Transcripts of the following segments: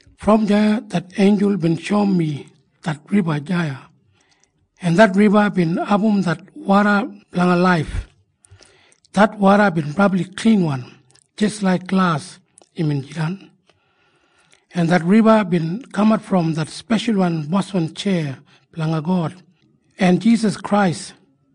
Brom deya det einjul bin shoum mi det riba deya, en det riba bin abum det woda blanga laif. Det woda bin brabli klinwan. Jis laik glas imbin jidan. En det riba bin kamat brom det speshal boswan tjeya blanga God en Jisas Krais,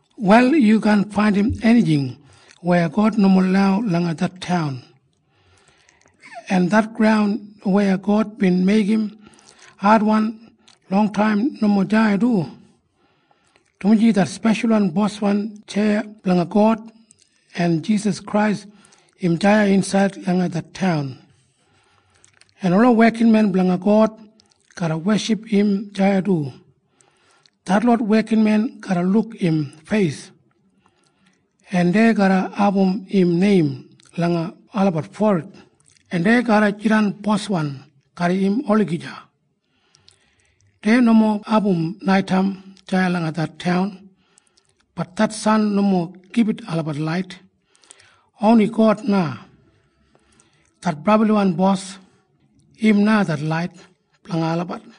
Wal yu kaan faindim enijing weya God nomo lau langa det taun. En det graun weya God bin meigim adwan longtaim nomo deya du, dumaji det speshal boswan tjeya blanga God en Jisas Krais im deya insaid langa det taun, en ola wekinmen blanga God garra weship im deya du. Detlot wekinmen garra luk im feis, en dei garra abum im neim langa olabat forid, en dei garra jidan boswan garram im olagija. Dei nomo abum naitaim deya langa det taun. Bat det san nomo gibit olabat lait. Oni God na, det Brabliwan Bos, im na det lait blanga olabat.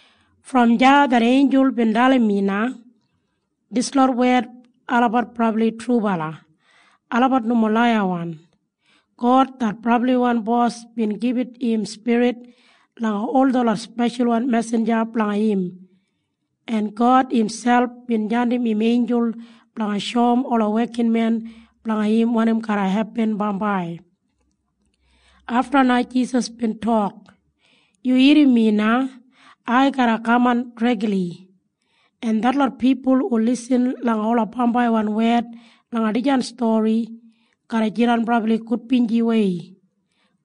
Brom deya det einjul bin dalim mi na, “Dislot wed olabat brabli trubala. Olabat nomo laiyawan. God det Brabliwan Bos bin gibit im spirit langa ol detlot speshalwan mesinja blanga im, en God imselp bin jandim im einjul blanga shoum ola wekinmen blanga im wanim garra hepin bambai.” Afta na Jisas bin tok, “Yu irrim mi na! Ai garra kaman dregli. En detlot pipul hu lisin langa ola bambaiwan wed langa dijan stori garra jidan brabli gudbinjiwei.”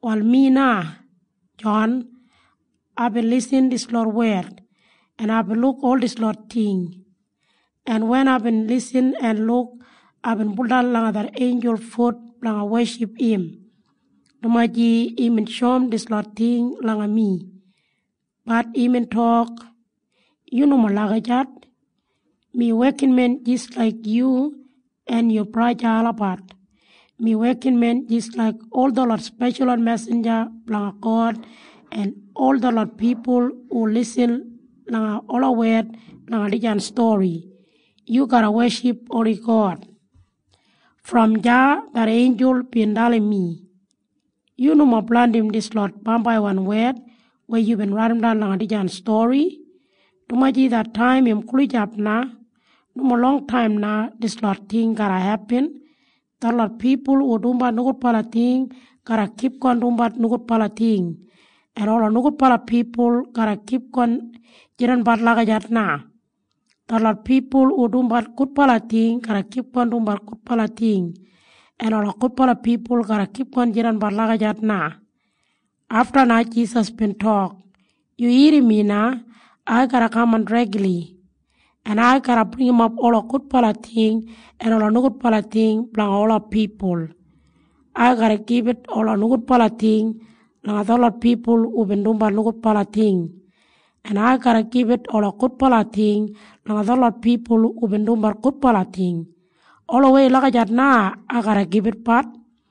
Wal mi na, Jon, en aibin lisin dislot wed, en aibin luk ol dislot ting. En wen aibin lisin en luk, aibin buldan langa det einjul fut blanga weship im, dumaji imbin shoum dislot ting langa mi. Bat imbin tok, “Yu nomo lagijat! Mi wekinmen jis laik yu en yu braja olabat. Mi wekinmen jis laik ol detlot speshalwan mesinja blanga God en ol detlot pipul hu teiknodis langa ola wed langa dijan buk. Yu garra weship oni God!” Brom deya det einjul bin dalim mi, “Yu nomo blandim dislot bambaiwan wed weya yubin raidimdan langa dijan stori, dumaji det taim im gulijap na. Nomo longtaim na dislot ting garra hepin. Detlot pipul hu dumbat nogudbala ting garra kipgon dumbat nogudbala ting, en ola nogudbala pipul garra kipgon jidanbat lagijat na. Detlot pipul hu dumbat gudbala ting garra kipgon dumbat gudbala ting, en ola gudbala pipul garra kipgon jidanbat lagijat na.” Afta na Jisas bin tok, “Yu irrim mi na! Ai garra kaman dregli. En ai garra bringimap ola gudbala ting en ola nogudbala ting blanga ola pipul. Ai garra gibit ola nogudbala ting langa detlot pipul hubin dumbat nogudbala ting, en ai garra gibit ola gudbala ting langa detlot pipul hubin dumbat gudbala ting. Olawei lagijat na ai garra gibitatbat.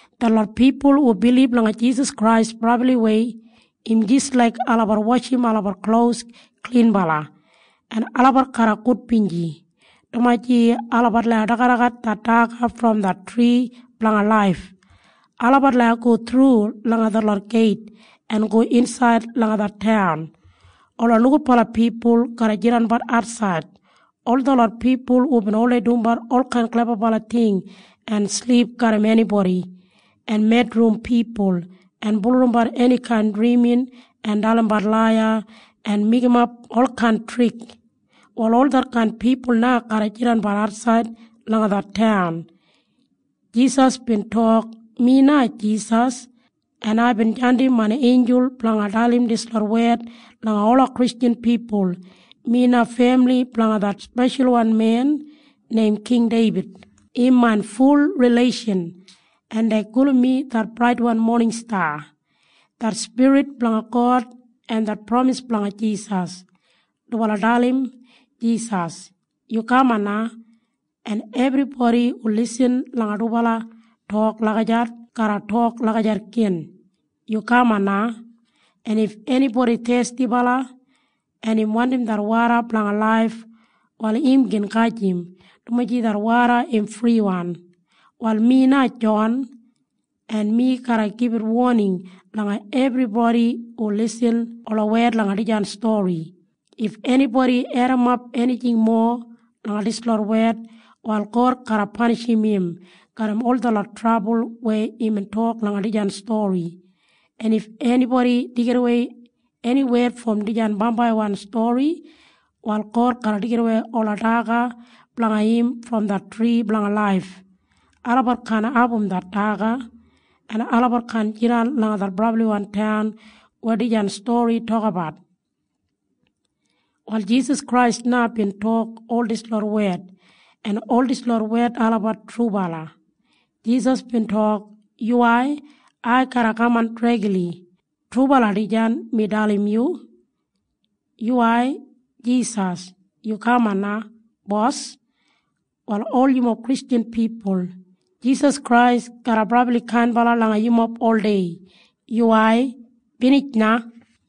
Detlot pipul hu bilib langa Jisas Krais brabliwei, im jis laik olabat washim olabat klos klinbala, en olabat garra gudbinji, dumaji olabat lau dagadagat det daga brom det tri blanga laif. Olabat lau go thru langa detlot geit en go insaid langa det taun. Ola nogudbala pipul garra jidanbat atsaid. Ol detlot pipul hubin oldei dumbat olkain klebabala ting en silip garram enibodi en medrim pipul en bulurrumbat enikain drimin en dalimbat laiya en meigimap olkain trik, wal ol detkain pipul na garra jidanbat atsaid langa det taun. Jisas bin tok, “Mi na Jisas, en aibin jandim main einjul blanga dalim dislot wed langa ola Kristjan pipul. Mi na femili blanga det speshalwan men neim King Deibid. Im main ful rileishan, en dei gulum mi det Braitwan Moningsta.” Det Spirit blanga God en det pramis blanga Jisas, dubala dalim Jisas, “Yu kaman na!” En ebribodi hu lisin langa dubala tok lagijat garra tok lagijat gin, “Yu kaman na!” En if enibodi thestibala, en im wandim det woda blanga laif, wal im gin gajim, dumaji det woda im friwan. Wal mi na Jon, en mi garra gibit woning langa ebribodi hu lisin ola wed langa dijan stori. If enibodi edimap enijing mowa langa dislot wed, wal God garra panishim im garram ol detlot trabul weya imbin tok langa dijan stori. En if enibodi deigidawei eni wed brom dijan bambaiwan stori, wal God garra deigidawei ola daga blanga im brom det tri blanga laif. Olabat kaan abum det daga, en olabat kaan jidan langa det brabliwan taun weya dijan stori tokabat. Wal Jisas Krais na bin tok ol dislot wed, en ol dislot wed olabat trubala. Jisas bin tok, “Yuwai! Ai garra kaman dregli! Trubala dijan mi dalim yu!” Yuwai, Jisas! Yu kaman na, Bos! Wal ol yumob Kristjan pipul, Jisas Krais garra brabli kainbala langa yumob oldei. Yuwai. Binij na.